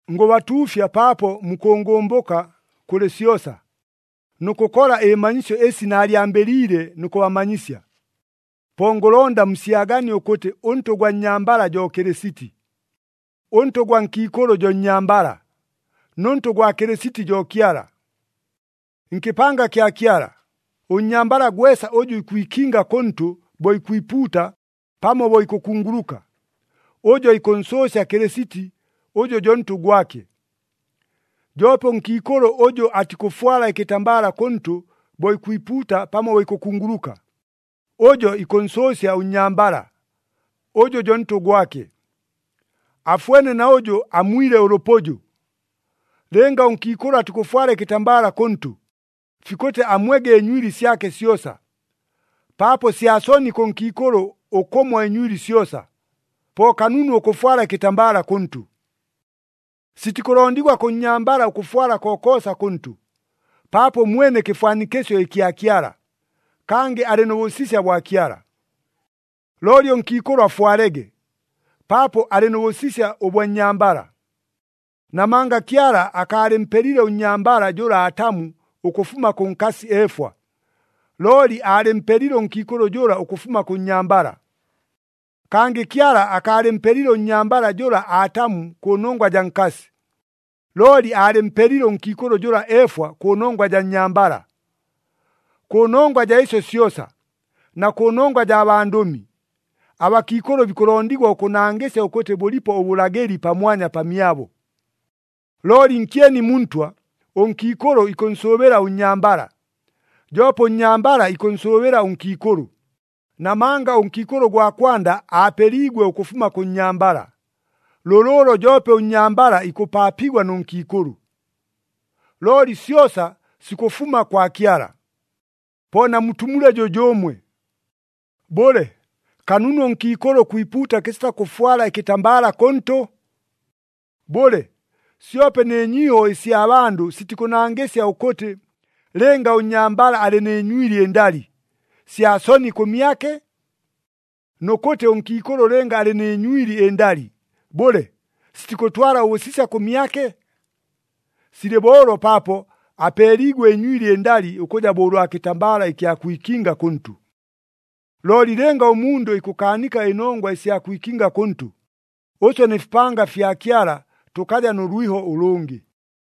Ngʉbatuufya paapo mukʉngʉmbʉka kʉlɨ syosa, nʉ kʉkola ɨmanyisyo ɨsi naalyambɨliile nʉ kʉbamanyisya. Po ngʉlonda musyaganie ʉkʉtɨ ʉntʉ gwa nnyambala jo Kɨlɨsiti, ʉntʉ gwa nkiikʉlʉ jo nnyambala, nʉ ntʉ gwa Kɨlɨsiti jo Kyala. Nkɨpanga kya Kyala, ʉnnyambala gwesa ʉjʉ ikwikinga kʉntʉ bo ikwipuuta pamo bo ikʉkunguluka, ʉjo ikʉnsʉʉsya Kɨlɨsiti ʉjʉ jo ntʉ gwake. Joope ʉnkiikʉlʉ ʉjʉ atikʉfwala ɨkɨtambala kʉntʉ bo ikwipuuta pamo bo ikʉkunguluka, ʉjo ikʉnsʉʉsya ʉnnyambala, ʉjʉ jo ntʉ gwake. Afwene na ʉjʉ amwile ʉlʉpʉjʉ. Lɨnga ʉnkiikʉlʉ atikʉfwala ɨkɨtambala kʉntʉ, fikʉtɨ amwege ɨnywili syake syosa. Paapo sya soni kʉ nkiikʉlʉ ʉkʉmwa ɨnywili syosa, po kanunu ʉkʉfwala ɨkɨtambala kʉntʉ. Sitikʉlondigwa kʉ nnyambala ʉkʉfwala kokoosa kʉntʉ, paapo ʉmwene kɨfwanikɨsyo ɨkya Kyala, kangɨ alɨ nʉ bʉsisya bwa Kyala. Looli ʉnkiikʉlʉ afwalege, paapo alɨ nʉ bʉsisya ʉbwa nnyambala. Namanga Kyala akaalɨmpelile ʉnnyambala jʉla Atamu ʉkʉfuma kʉ nkasi Efwa, looli aalɨmpelile ʉnkiikʉlʉ jʉla ʉkʉfuma kʉ nnyambala. Kangɨ Kyala akaalɨmpelile ʉnnyambala jʉla Atamu kʉnongwa jaa nkasi, looli aalɨmpelile ʉnkiikʉlʉ jʉla Efwa kʉnongwa jaa nnyambala. Kʉnongwa jaa ɨsyo syosa, na kʉnongwa jaa bandʉmi, abakiikʉlʉ bikʉlondigwa ʉkʉnangɨsya ʉkʉtɨ bʉlipo ʉbʉlagɨli pamwanya pamyabo. Looli nkyeni mu Ntwa, ʉnkiikʉlʉ ikʉnsʉʉbɨla ʉnnyambala, joope ʉnnyambala ikʉnsʉʉbɨla ʉnkiikʉlʉ, namanga ʉnkiikʉlʉ ʉgwa kwanda aapeliigwe ʉkʉfuma kʉ nnyambala, lʉlʉʉlo joope ʉnnyambala ikʉpaapigwa nʉ nkiikʉlʉ. Looli syosa sikʉfuma kwa Kyala. Po namutumule jʉjʉʉmwe. Bʉle, kanunu ʉnkiikʉlʉ ʉkwipuuta kɨsita kʉfwala ɨkɨtambala kʉntʉ? Bʉle, syope nɨ nyiiho ɨsya bandʉ sitikʉnangɨsya ʉkʉtɨ, lɨnga ʉnnyambala alɨ nɨ nywili ɨndali, sya soni kʉmyake? Nʉ kʉtɨ ʉnkiikʉlʉ lɨnga alɨ nɨ nywili ɨndali, bʉle, sitikʉtwala ʉbʉsisya kʉmyake? Silɨ bo ʉlo paapo apeeliigwe ɨnywili ɨndali ʉkʉja bo ʉlwa kɨtambala ɨkya kwikinga kʉntʉ. Looli lɨnga ʉmundʉ ikʉkaanika ɨnongwa ɨsya kwikinga kʉntʉ, ʉswe nɨ fipanga ɨfya Kyala tʉkaja nʉ lwiho ʉlʉngɨ.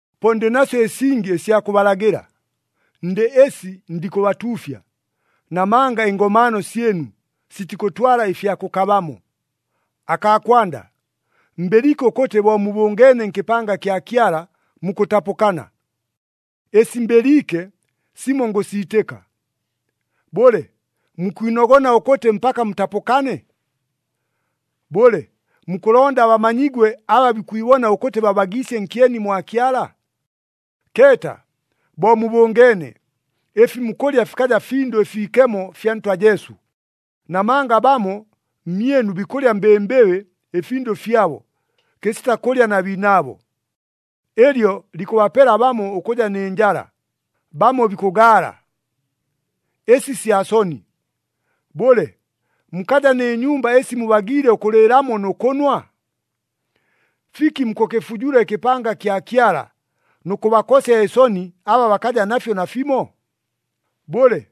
Po ndɨ nasyo ɨsingi ɨsya kʉbalagɨla. Ndɨ ɨsi ndikʉbatuufya, namanga ɨngomaano syɨnu, sitikʉtwala ɨfya kʉkabamo. Akaa kwanda, mbɨliike ʉkʉtɨ bo mubʉngeene nkɨpanga kya Kyala, mukʉtapʉkana. Ɨsi mbɨliike, simo ngʉsiitɨka. Bʉle, mukwinogona ʉkʉtɨ mpaka mutapʉkane? Bʉle, mukʉlonda bamanyigwe aba bikwibona ʉkʉtɨ babagiisye nkyeni mwa Kyala? Keeta, bo mubʉngeene, ɨfi mukʉlya fikaja Findʉ ɨFiikemo fya Ntwa Jesu, namanga bamo mmyɨnu bikʉlya mbɨmbɨbɨ ɨfindʉ fyabo, kɨsita kʉlya na biinaabo. Ɨlyo likʉbapela bamo ʉkʉja nɨ njala, bamo bikʉgaala. Ɨsi sya soni! Bʉle, mukaja nɨ nyumba ɨsi mubagiile ʉkʉlɨɨlamo nʉ kʉnwa? Fiki mukʉkɨfujula ɨkɨpanga kya Kyala, nʉ kʉbakosya ɨsoni aba bakaja nafyo nafimo? Bʉle,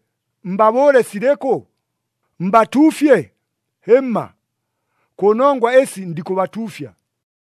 mbabʉʉle silɨkʉ? Mbatuufye? Hɨmma! Kʉ nongwa ɨsi ndikʉbatuufya.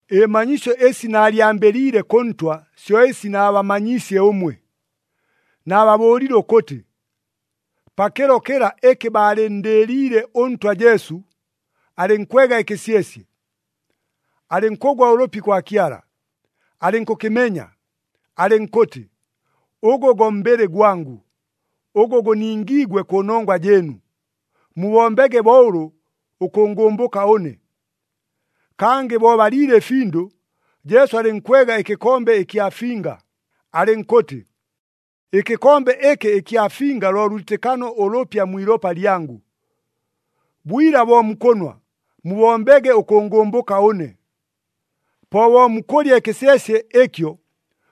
Ɨmanyisyo ɨsi naalyambɨliile kʉ Ntwa syo ɨsi naabamanyiisye ʉmwe. Naababʉʉlile ʉkʉtɨ, pakɨlo kɨla ɨkɨ baalɨnndɨɨliile ʉNtwa Jesu, alɨnkwega ɨkɨsyesye, alɨnkʉgwa ʉlʉpi kwa Kyala, alɨnkʉkɨmenya, alɨnkʉtɨ, “Ʉgʉ go mbɨlɨ gwangʉ, ʉgʉ gʉningiigwe kʉnongwa jɨɨnu. Mubombege bo ʉlʉ ʉkʉngʉmbʉka ʉne.” Kangɨ bo baliile ɨfindʉ, Jesu alɨnkwega ɨkɨkombe ɨkya finga, alɨnkʉtɨ, “Ɨkɨkombe ɨkɨ ɨkya finga lo lwitɨkano ʉlʉpya mwi ilopa lyangʉ. Bwila bo mukʉnwa, mubombege ʉkʉngʉmbʉka ʉne.” Po bo mukʉlya ɨkɨsyesye ɨkyo,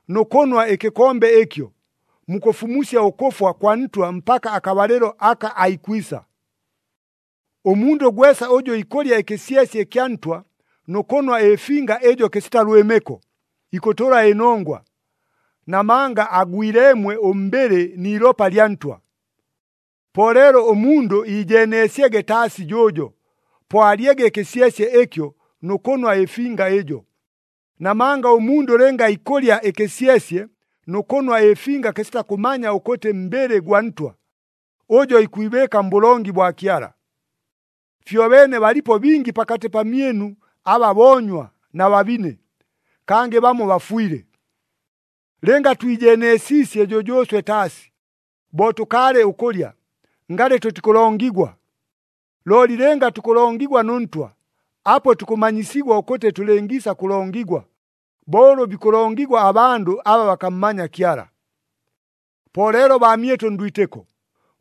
nʉ kʉnwa ɨkɨkombe ɨkyo, mukʉfumusya ʉkʉfwa kwa Ntwa mpaka akabalɨlo aka aikwisa. Ʉmundʉ gwesa ʉjʉ ikʉlya ɨkɨsyesye ɨkya Ntwa nʉ kʉnwa ɨfinga ɨjo kɨsita lwɨmɨko, ikʉtʉla ɨnongwa, namanga agwileemwe ʉmbɨlɨ ni ilopa lya Ntwa. Po leelo ʉmundʉ iijeeneesyege taasi jʉʉjo, po alyege ɨkɨsyesye ɨkyo nʉ kʉnwa ɨfinga ɨjo, namanga ʉmundʉ lɨnga ikʉlya ɨkɨsyesye nʉ kʉnwa ɨfinga kɨsita kʉmanya ʉkʉtɨ mbɨlɨ gwa Ntwa, ʉjo ikwibɨɨka mbʉlongi bwa Kyala. Fyobeene balipo bingi pakatɨ pamyɨnu aba boonywa na babine, kangɨ bamo bafwile. Lɨnga twijeeneesiisye jʉjʉʉswe taasi, bo tʉkaalɨ ʉkʉlya, ngalɨ tʉtikʉlongigwa. Looli lɨnga tukʉlongigwa nʉ Ntwa, apo tukʉmanyisigwa ʉkʉtɨ tʉlɨngiisa kʉlongigwa, bo ʉlʉ bikʉlongigwa abandʉ aba bakammanya Kyala. Po leelo baamyɨtʉ ndwitɨko,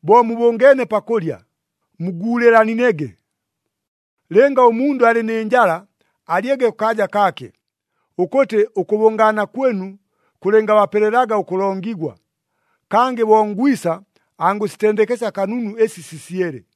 bo mubʉngeene pakʉlya, muguulɨlanege. Lɨnga ʉmundʉ alɨ nɨ njala, alyege kʉkaaja kaake, ʉkʉtɨ ʉkʉbʉngaana kwɨnu kʉlɨngabapelelaga ʉkʉlongigwa. Kangɨ bo ngwisa, angʉsitendekesya kanunu ɨsi sisyele.